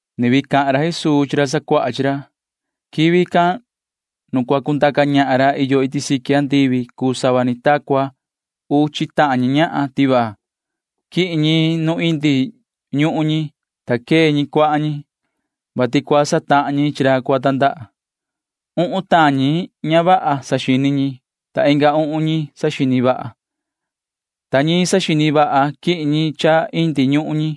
[Ni vii cahan ra Jesuu chi ra sacuaha chi ra:] ’Quivi can nu cua cundaca ñahan ra iyo iti siqui andivi cuu sava ni ta cua uchi tahan ñi ñahan tivaa. Quihin ñi nu indi ñuhun ñi, ta quee ñi cuahan ñi, vati cua satahan ñi chi ra cua tandaha. Uhun tahan ñican ña vaha saxini ñi, ta inga uhun ñi saxini vaha ñi. Ta ñi ña saxini vaha―quihin ñi cha indi ñuhun ñi,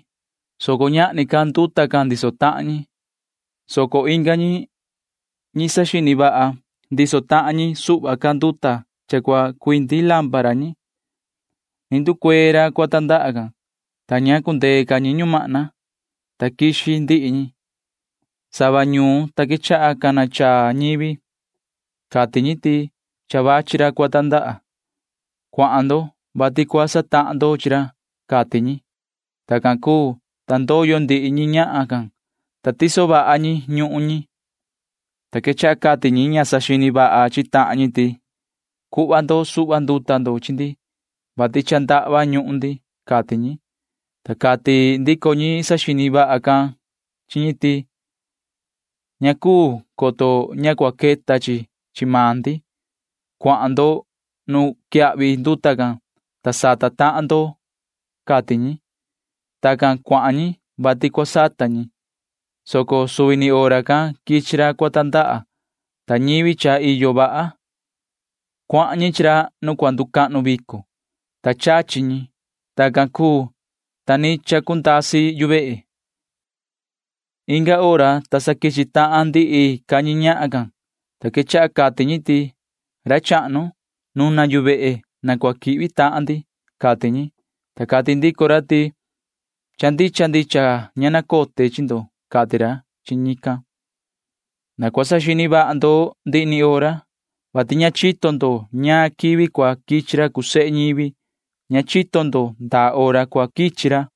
soco ñahni ca nduta can ndiso tahan ñi, soco inga ñi―ñi saxini vaha ndiso tahan ñi suhva ca nduta cha cua cuindi lampara ñi. Ni nducuee ra cua tandaha can, ta ña cundee ca ñi ñumahna, ta quixi ndihi ñi. Nda sava ñuun, ta quechaha cana chaa ñivi. Cati ñi ti: “Cha vachi ra cua tandaha. Cuahan ndo, vati cua satahan ndo chi ra,” cati ñi. Tacan cuu, ta ndoyo ndihi ñi ñahan can, ta tiso vaha ñi ñuhun ñi, ta quechaha cati ñi ña saxini vaha chi tahan ñi ti: “Cuhva ndo suhva nduta chi ndi, vati cha ndahva ñuhun ndi,” cati ñi, ta cati ndico ñi saxini vaha chi ñi ti: “Ña cuu, coto ña cua queta chi chi maan ndi. Cuahan ndo nu quiyahvi nduta can, ta sata tahan ndo,” cati ñi. Tacan cuahan ñi, vati cua sata ñi, soco suvi ni hora can quichi ra cua tandaha, ta ñivi cha iyo vaha―cuahan ñi chi ra nu cua nducahnu vico, ta chachi ñi. Tacan cuu, ta ni chacundasi yu vehe. Inga hora, ta sa quichi tahan ndihi ca ñi ñahan can, ta quechaha cati ñi ti: “Yoho ra chahnu, nuna yu vehe na cua quihvi tahan ndi,” cati ñi, ta cati ndico ra ti: “Cha ndicha ndicha ña nacote chi ndo,” cati ra chi ñican. ’Na cua saxini vaha ndo ndihi ni hora, vati ña chito ndo ñaan quivi cua quichi ra cuu sehe ñivi. Ña chito ndo ndaa hora cua quichi ra.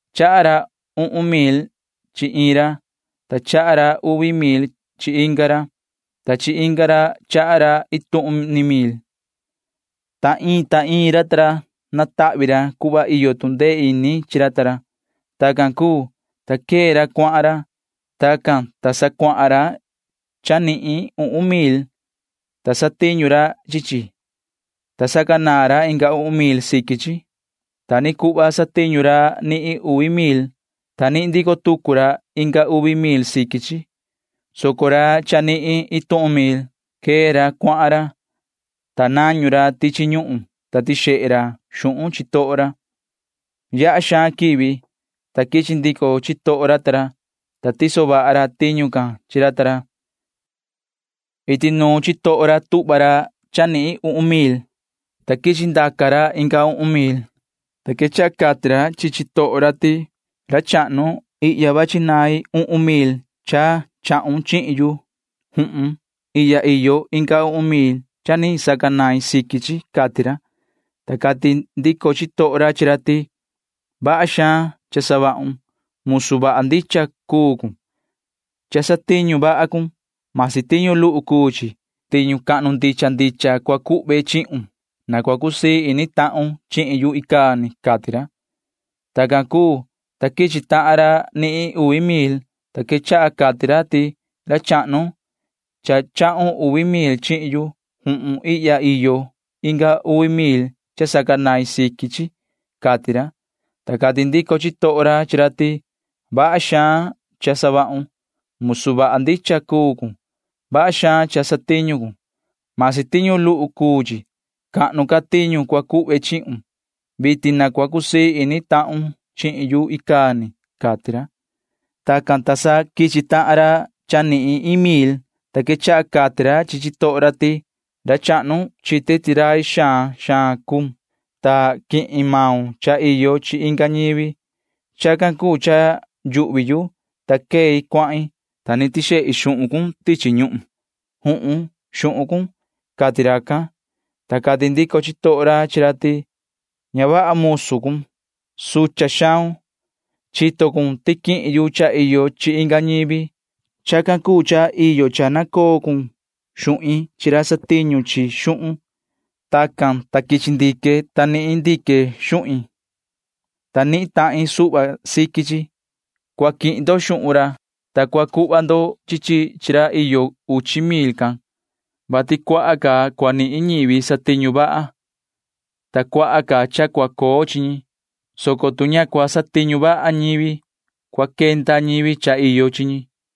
’Chaha ra uhun mil chi iin ra, ta chaha ra uvi mil chi inga ra, ta chi inga ra chaha ra iin tuhun ni mil. Ta iin ta iin ra natahvi ra cuhva iyo tu ndee ini chi ra ta ra. Tacan cuu, ta quee ra cuahan ra. Tacan, ta sa cuahan ra cha nihin uhun mil, ta satiñu ra chi chi, ta sacanaan ra inga uhun mil siqui chi. Ta ni cuhva satiñu ra cha nihin uvi mil, ta nihin ndico tucu ra inga uvi mil siqui chi, soco ra cha nihin iin tuhun mil―quee ra cuahan ra, ta nañu ra tichi ñuhun, ta tixehe ra xuhun chitoho ra. ’Yaha xaan quivi, ta quichi ndico chitoho ra ta ra, ta tiso vaha ra tiñu can chi ra ta ra. Iti nuun chitoho ra tuhva ra cha nihin uhun mil, ta quichi ndaca ra inga uhun mil, ta quechaha cati ra chi chitoho ra ti: “Ra chahnu, ihya vachi nain uhun mil cha chahun chihin yu. Juhun. Ihya iyo inga uhun mil cha ni sacanain siqui chi,” cati ra, ta cati ndico chitoho ra chi ra ti: “Vaha xaan cha savahun. Musu vaha ndicha cuun. Cha satiñu vaha cun―masi tiñu luhu cuu chi. Tiñu cahnu ndicha ndicha cua cuhve chihun. Na cua cusii ini tahun chihin yu icaa ni,” cati ra. Tacan cuu, ta quichi tahan ra nihin uvi mil, ta quechaha cati ra ti: “Ra chahnu, cha chahun uvi mil chihin yu. Juhun. Ihya iyo inga uvi mil cha sacanain siqui chi,” cati ra, ta cati ndico chitoho ra chi ra ti: “Vaha xaan cha savahun. Musu vaha ndicha cuun. Vaha xaan cha satiñu cun―masi tiñu luhu cuu chi. Cahnu ca tiñu cua cuhve chihun. Vitin na cua cusii ini tahun chihin yu icaa ni,” cati ra. Tacan, ta sa quichi tahan ra cha nihin iin mil, ta quechaha cati ra chi chitoho ra ti: “Ra chahnu, chite ti rai xaan xaan cuun, ta quihin maun cha iyo chi inga ñivi. Chacan cuu cha yuhvi yu, ta quei cuahin, ta ni tixehi xuhun cun tichi ñuhun. Juhun, xuhun cun,” cati racan, ta cati ndico chitoho ra chi ra ti: “Ña vaha musu cuun. Sucha xaun. Chito cun ti quihin yu cha iyo chi inga ñivi. Chacan cuu cha iyo cha nacoo cun xuhin chi ra satiñu chi xuhun. Tacan, ta quichi ndique, ta nihin ndique xuhin, ta nihin tahin suhva siqui chi.” Cua quihin ndo xuhun ra, ta cua cuhva ndo chi chi chi ra iyo uchi mil can, vati cuaha ca cua nihin ñivi satiñu vaha, ta cuaha suhva cua coo chi ñi, soco tu ña cua satiñu vaha ñivi, cua quenda ñivi cha iyo chi ñi.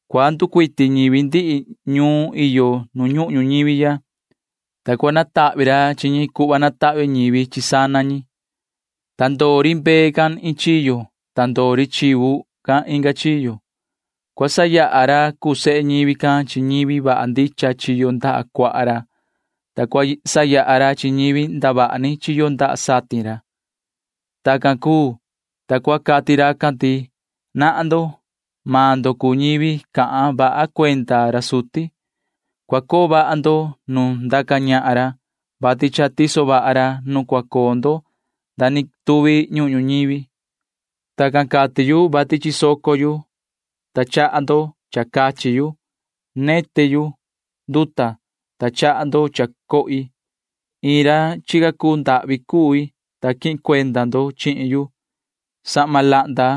Cua nducuiti ñivi ndihi ñuun iyo nu ñuhun ñuñivi ya, ta cua natahvi ra chi ñi cuhva natahvi ñivi chi sana ñi, ta ndoo ri mbee can iin chiyo, ta ndoo ri chivu can inga chiyo. Cua sayaha ra cuu sehe ñivi can chi ñivi vaha ndicha chiyo ndaha cuaha ra, ta cua sayaha ra chi ñivi ndavaha ni chiyo ndaha satin ra. Tacan cuu, ta cua cati racan ti: “Nahan ndo. Maan ndo cuu ñivi cahan vaha cuenda ra suti. Cua coo vaha ndo nu ndaca ñahan ra, vati cha tiso vaha ra nu cua coo ndo nda ni tuvi ñuhun ñuñivi. [Tacan cati yu,] vati chisoco yu, ta chaha ndo cha cachi yu. Neti yu nduta, ta chaha ndo cha cohi. Toho cui chica cui, ta quihin cuenda ndo chihin yu. Sahma lahnda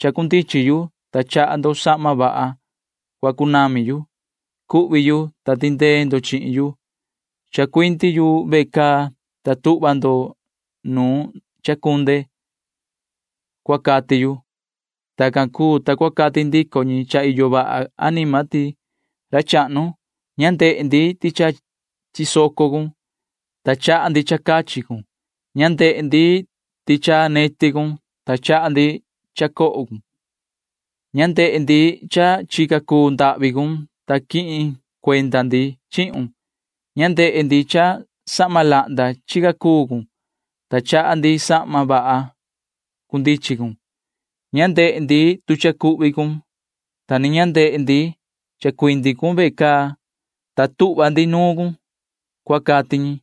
chacunami yu, ta chaha ndo sahma vaha cua cunami yu. Cuhvi yu, ta tindee ndo chihin yu. Chacuindi yu ve caa, ta tuhva ndo nuun chacunde,” cua cati yu. Tacan cuu, ta cua cati ndico ñi cha iyo vaha anima ti: “Ra chahnu, ña ndehe ndi ti cha chisoco cun, ta chaha ndi cha cachi cun. Ña ndehe ndi ti cha neti cun, ta chaha ndi cha cohun. Ña ndehe ndi ti toho cuun, ta quihin cuenda ndi chihun. Ña ndehe ndi cha sahma lahnda chica cuu cun, ta chaha ndi sahma vaha cunami cun. Ña ndehe ndi ti cha cuhvi cun, ta ni ña ndehe ndi chacuindi cun ve caa, ta tuhva ndi nuun cun,” cua cati ñi,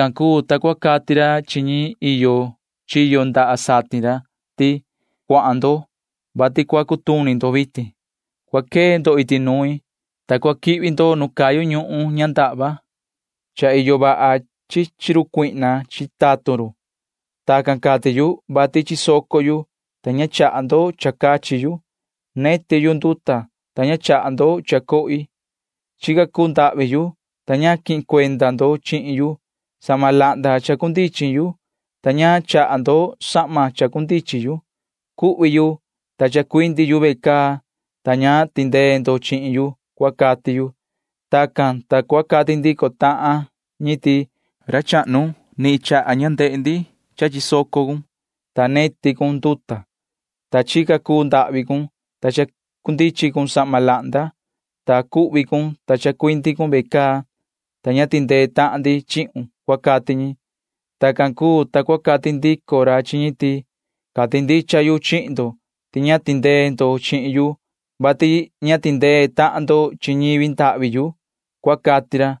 ’Tacan cuu, ta cua cati ra chi ñi iyo chiyo ndaha satin ra ti: “Cuahan ndo, vati cua cutuni ndo vitin. Cua quee ndo iti nuin, ta cua quihvi ndo nu cayu ñuhun ña ndahva. Cha iyo vaha chi chi run cuihna chi tatun run. [Tacan cati yu,] vati chisoco yu, ta ña chaha ndo cha cachi yu. Neti yu nduta, ta ña chaha ndo cha cohi. Toho cui chica cui, ta ña quihin cuenda ndo chihin yu. Sahma lahnda chacunami yu, ta ña chaha ndo sahma chacunami yu. Cuhvi yu, ta chacuindi yu ve caa, ta ña ni tindee ndo chihin yu,” cua cati yu. Tacan, ta cua cati ndico tahan ñi ti: “Ra chahnu, ña tuhva ndi ndehe ndi ti chisoco cun, ta neti cun nduta, ta toho cuun chica cuu cun, ta chacunami cun sahma lahnda, ta cuhvi cun, ta chacuindi cun ve caa, ta ña tindee tahan ndi chihun,” cua cati ñi. Tacan cuu, ta cua cati ndico ra chi ñi ti: “Cati ndicha yu chihin ndo ti ña tindee ndo chihin yu, vati ña tindee tahan ndo chi ñivi ndahvi yu,” cua cati ra.